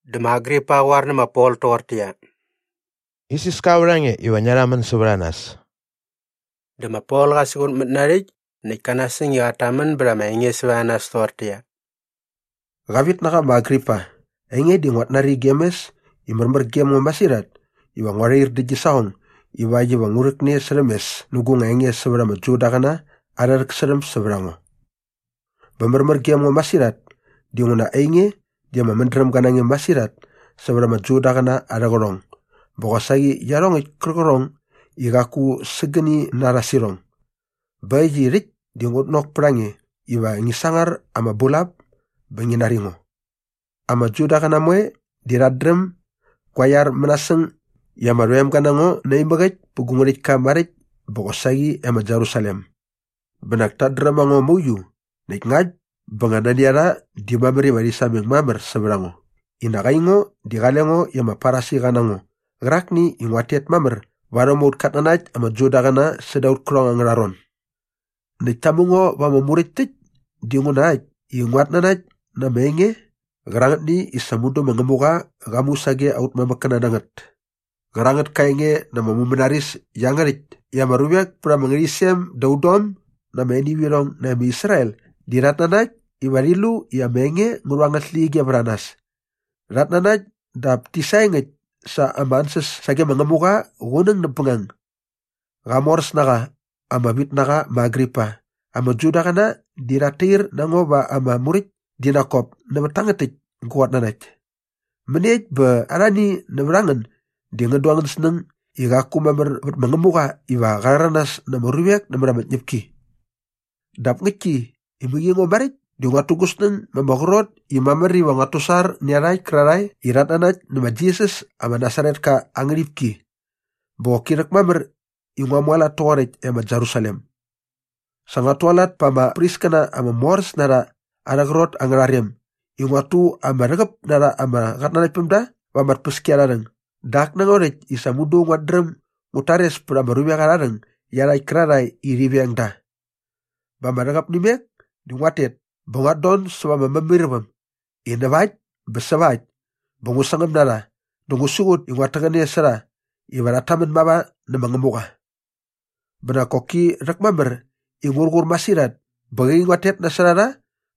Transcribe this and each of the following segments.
Dä ma Agripa qä qoar nä ma Pol toqortäqyia, “Isiska vät a nge iva ngia rhamän sävät a nas.” Dä ma Pol qa siqutmät na aa rhäkt näkt ka nasäng i qat tamän bät ama enge sävät a nas toqortäqyia, “Qavitnaqa ma Agripa, ainge di nguat nari gem mes i märmär gem ngo masirhat iva ngua rhair dä gi saqong ivakt iva ngu rhäkne särhäm mes nä gu nga enge sävät ama Judaqäna arhä rhäksärhäm sävät a ngo. Bä märmär gem ngo masirhat dinguna ainge di ama mädrämga na nge masirhat sävät ama Judaqäna arhä qärhong bä qosaqi iarhongäkt kärqärhong i qaku sägäni na rha sä irhong. Bä äkt i rhäkt di ngut nok pät a nge iva ngi sangar ama bulap bä ngi nari ngo. “Ama Judaqäna moe di rhat dräm gua iar mänasäng i ama rhoemga na ngo naimäk äkt pä gu ngärhäktka maräkt bä qosaqi e ma Jerusalem. Bä nak tat dräm a ngo mauiu näkt ngakt bä nga nani a rha di mamär iva rhi sameng mamär sävät a ngo i nak aingo di qale ngo i ama Farisiqa na ngo qärakni i nguat tet mamär varhäm aut katnanakt ama Judaqäna säda aut kärhong angärha ron. Näkt ta mu ngo va ama muräkt täkt dinguna äkt i nguat nanakt na ama enge qärangätni i sa mudu ma Ngämuqa qa mu sage aut mamäkkäna na ngät. “Qärangät ka enge na ama mumänaris iangärhäkt i ama ruvek pät ama ngärhäqyisem da udom na ama enivirhong nae ma Israel di rhat nanakt iva rhi lu i ama enge ngä rhu angät släqyige vät a nas. Rhat nanakt dap ti saengäkt sa ama ansäs sage ma Ngämuqa qunäng näp bängang. Qamoräsnaqa ama vitnaqa ma Agripa, ama Judaqäna di rhat tair na ngo va ama muräkt di nak kop nävät tangät täkt gu qatnanakt. Mäniekt bä arhani nävät a ngän di ngän du angän snäng i qaku mamär vät ma Ngämuqa iva qa rhäranas na ama ruvek nämät ama tñäpki? “Dap ngäktki i mäqi ngo maräkt di nguat tu gu snäng ma ama qrot i mamär iva nguat tusar nä iarhakt kärarhae i rhat nanakt nä ma Jisas ama Nasaretka aa ngärhipki. Bä qoki rhäkmamär i ngua mualat toqoräkt e ma Jerusalem. Sa nguat tualat pa ama priskäna ama moräs na rha arhä qrot angärha rem i nguat tu ama rhäqäp na rha ama qatnanaktpämda va ama tpäskiarharhäng dä ak na ngo rhäkt i sa mudu nguat dräm ngut tares pät ama ruvek arha rhäng iarhakt kärarhae i rhi veng da. Bä ama rhäqäp nä imek dä nguat tet bä nguat don säva ama mämairväm i näva äkt bä säva äkt bä ngu sangäm na rha dä ngu siqut i nguat täqäne sä rha iva rhat tamän mava nä ma Ngämuqa. Bä nak koki rhäkmamär i ngur qur masirhat bä qäqi nguat tet nasot a rha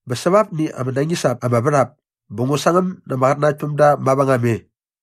bä säva apni ama nañis ap ama värhap bä ngu sangäm na ama qatnanaktpämda mavängam e.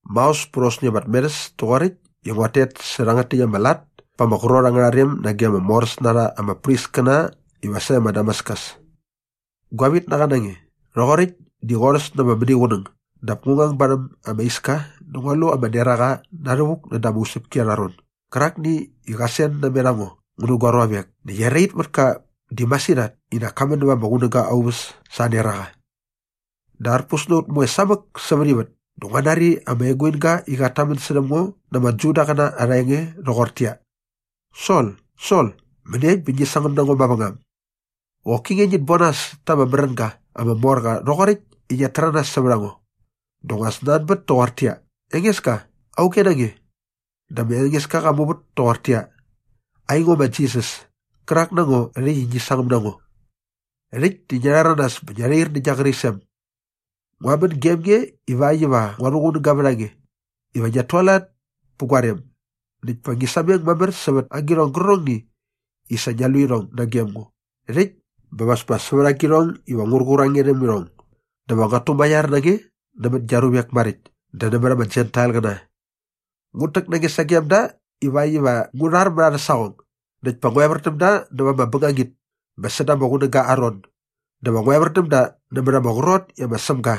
“Maos pät aosni ama tmerhäs toqoräkt di nguat tet sä iangärhäkt ama lat pa ama qrot angärha rem nage ama moräs na rha ama priskäna iva sae ma Damaskus. Gua vitnaqa na nge, rhoqoräkt di qorhäs na ama mäniqunäng dap ngu ngang barhäm ama iska dä ngua lu ama neraqa na rhävuk näda ama usäpki arha ron gärakni i qä sen namet a ngo ngu nä gua ruavek näkt erait mät ka di masirhat i nak ka män näva ama qunäga aa uväs sa aa neraqa. Dä arpus na ut moe samäk sävät ivät dä ngua nari ama eguinga i qat tamän särhäm ngo na ama Judaqäna arha enge rhoqortäqyia, ‘Sol, Sol, mäniekt bä ngi sangäm na ngo mavängam? Qoki nge ngit bon nas ta ama märänga ama mor qa rhoqoräkt i ngiat täranas sävät a ngo.’ “Dä ngua snanbät toqortäqyia, ‘Engeska, auge na nge?’ “Dä ma Engeska qa muvät toqortäqyia, ‘Aingo ma Jisas, kärak na ngo rhäkt i ngi sangäm na ngo. Rhäkt di ngia rhäranas bä ngia rhair nä gia qärisem. Ngua män gem nge ivakt iva ngua rhuqunän bät a nge iva ngiat tualat pä gua rem näkt pa ngi sameng mamär sävät agirhong gärqärhongni i sa ngia lu irhong nagem ngo rhäkt bä va as pa sävät guarhong iva ngur qur a nge rhäm irhong. “‘Dä va nguat tumaiar na nge nämät gia ruvek maräkt dä nämät ama Jentailqäna. Ngut täk na nge sagem da ivakt iva ngu rhar mät arhä saqong näkt pa ngu evär däm da näva ama bängangit bä säda ama qunäga aa ron dä va ngu evär däm da nämät ama qrot i ma Sämga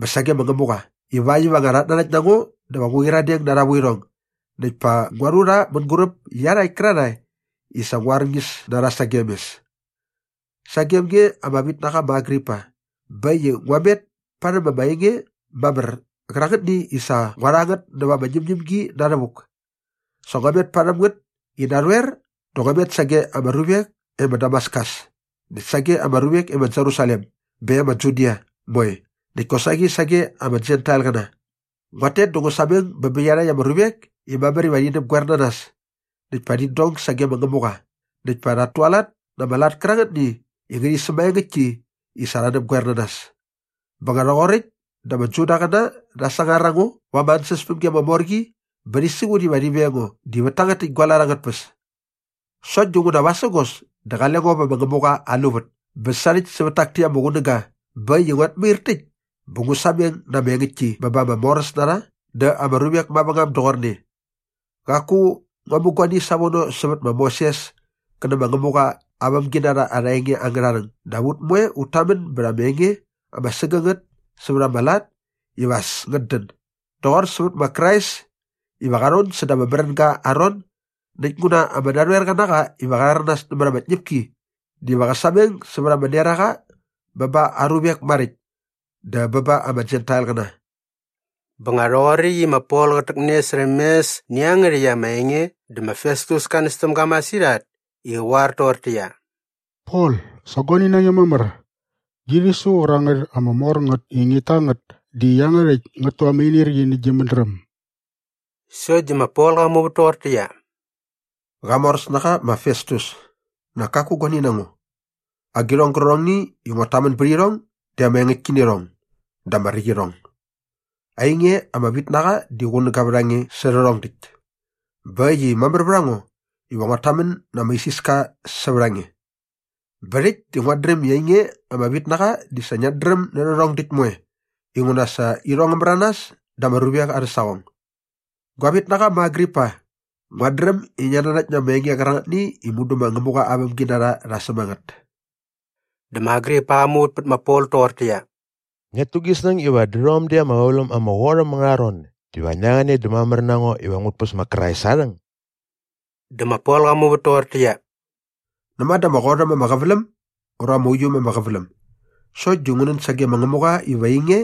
bä sage ma Ngämuqa ivakt iva nga rhat nanakt na ngo dä va ngu qyiradeng na arha vuirhong näkt pa ngua rhu rha mänguräp iarhakt kärarhae i sa ngua arñis na rha sage mes.’ “Sagem nge ama vitnaqa ma Agripa, bä äkt i ngua met parhäm ama enge mamär qärangätni i sa ngua rha ngät näva ama ñämñämgi na rhävuk. Sa ngua met parhäm ngät i narhoer dä ngua met sage ama ruvek e ma Damaskus näkt sage ama ruvek e ma Jerusalem bä e ma Judia moe näkt kosaqi sage ama Jentailqäna. Nguat tet dä ngu sameng bä bä iarhakt ama ruvek i mamär iva rhi näpgoer na nas näkt pa rhit dong sage ma Ngämuqa näkt pa rhat tualat na ama lat kärangätni i ngärhi sämaengäktki i sa rha näpgoer na nas. “Bä nga rhoqoräkt dä ama Judaqäna rha sangar a ngo va ama ansäspämgi ama mor qi bä rhi siqut iva rhi veng ngo di vät tangät täkt gua lat angät tpäs. Sokt dinguna vasägos dä qale ngo vä ma Ngämuqa aa luvät bä sarhäkt sävät tak täkt ama qunäga bä äkt i nguat mair täkt bä ngu sameng na ama engäktki bä ba ama moräsnarha dä ama ruvek mavängam doqorne. Qaku ngua mu guani savono sävät ma Moses kä nä ma Ngämuqa aa vämginarha arha enge angärha rhäng dap ut moe ut tamän bät ama enge ama sägängät sävät ama lat iva as ngät dän doqor sävät ma Krais iva qa rhon säda ama märänga aa ron näkt nguna ama narhoerqa na qa iva qa rhäranas nämät ama tñäpki diva qä sameng sävät ama neraqa bä ba aa ruvek maräkt dä bä ba ama Jentailqäna.” Bä nga rhoqoräkt i ma Pol qät täkne särhäm mes nä iangärhäkt ama enge dä ma Festus ka näs täm ga masirhat i qä qoar toqortäqyia, “Pol, sa guani na nge mamär! Gi rhisu qärangät ama mor ngät i ngit ta ngät di iangärhäkt ngät tu ama inirqi nä gi mädräm.” Sokt di ma Pol qa muvät toqortäqyia, “Qamoräsnaqa ma Festus, nak kaku guani na ngo. Agirhong gärqärhongni i nguat tamän bät irhong di ama engäktki nä irhong dä ama räkt irhong. Ainge ama vitnaqa di qunäga vät a nge sä rhärhong däkt bä äkt i mamär vät a ngo iva nguat tamän na ama isiska sävät a nge. Bä rhäkt di nguat dräm i ainge ama vitnaqa di sa ngiat dräm nä rhärhong däkt moe inguna sa irhong ngä märanas da ama ruvek arhä saqong. “Gua vitnaqa ma Agripa, nguat dräm i ngiat nanakt na ama enge qärangätni i mudu ma Ngämuqa aa vämginarha rha säm a ngät.” Dä ma Agripa qa muvät pät ma Pol toqortäqyia, “Ngiat tu gi snäng iva dä rhom däkt ama qäväläm ama qot äm angärha ron diva ngia rhäqäne dä mamär na ngo iva ngut päs ma Krais aa rhäng?” Dä ma Pol qa muvät toqortäqyia, “Näma dä ama qot äm ama qäväläm ura ama uiu äm ama qäväläm sokt di ngu nän sage ma Ngämuqa iva ainge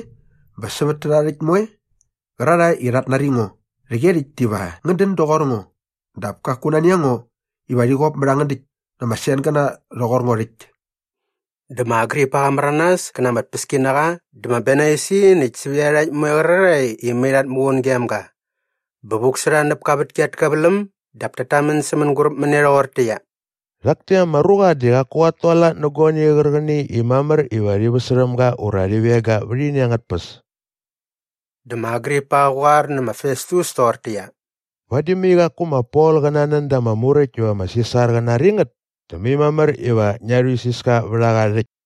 bä sävät tärha rhäkt moe qärarhae i rhat nari ngo rhäqyerhäkt diva ngän dän doqor ngo dap kaku nani a ngo iva rhit kop mät angän däkt na ama sengäna rhoqor ngo rhäkt.” Dä ma Agripa qa märanas kä na ama tpäskinaqa dä ma Bernaisi näkt sävät iarhakt moe qärarhae i mai rhat muqun gem ga. Bä vuk sä rha näp ka vätki at käväläm dap tat tamän sä mänguräp mä ne rhoqortäqyia, “Rhak täkt ama ruqa di qaku qat tualat nä guani qärqäni i mamär iva rhi väsärhäm ga ura rhi veng ga vät ini angät tpäs.” Dä ma Agripa qä qoar nä ma Festus toqortäqyia, “Vadi mai qaku ma Pol qä nanän da ama muräkt iva ma Sisar qä nari ngät dä mai mamär iva ngia rhuisiska vät a qa rhäkt.”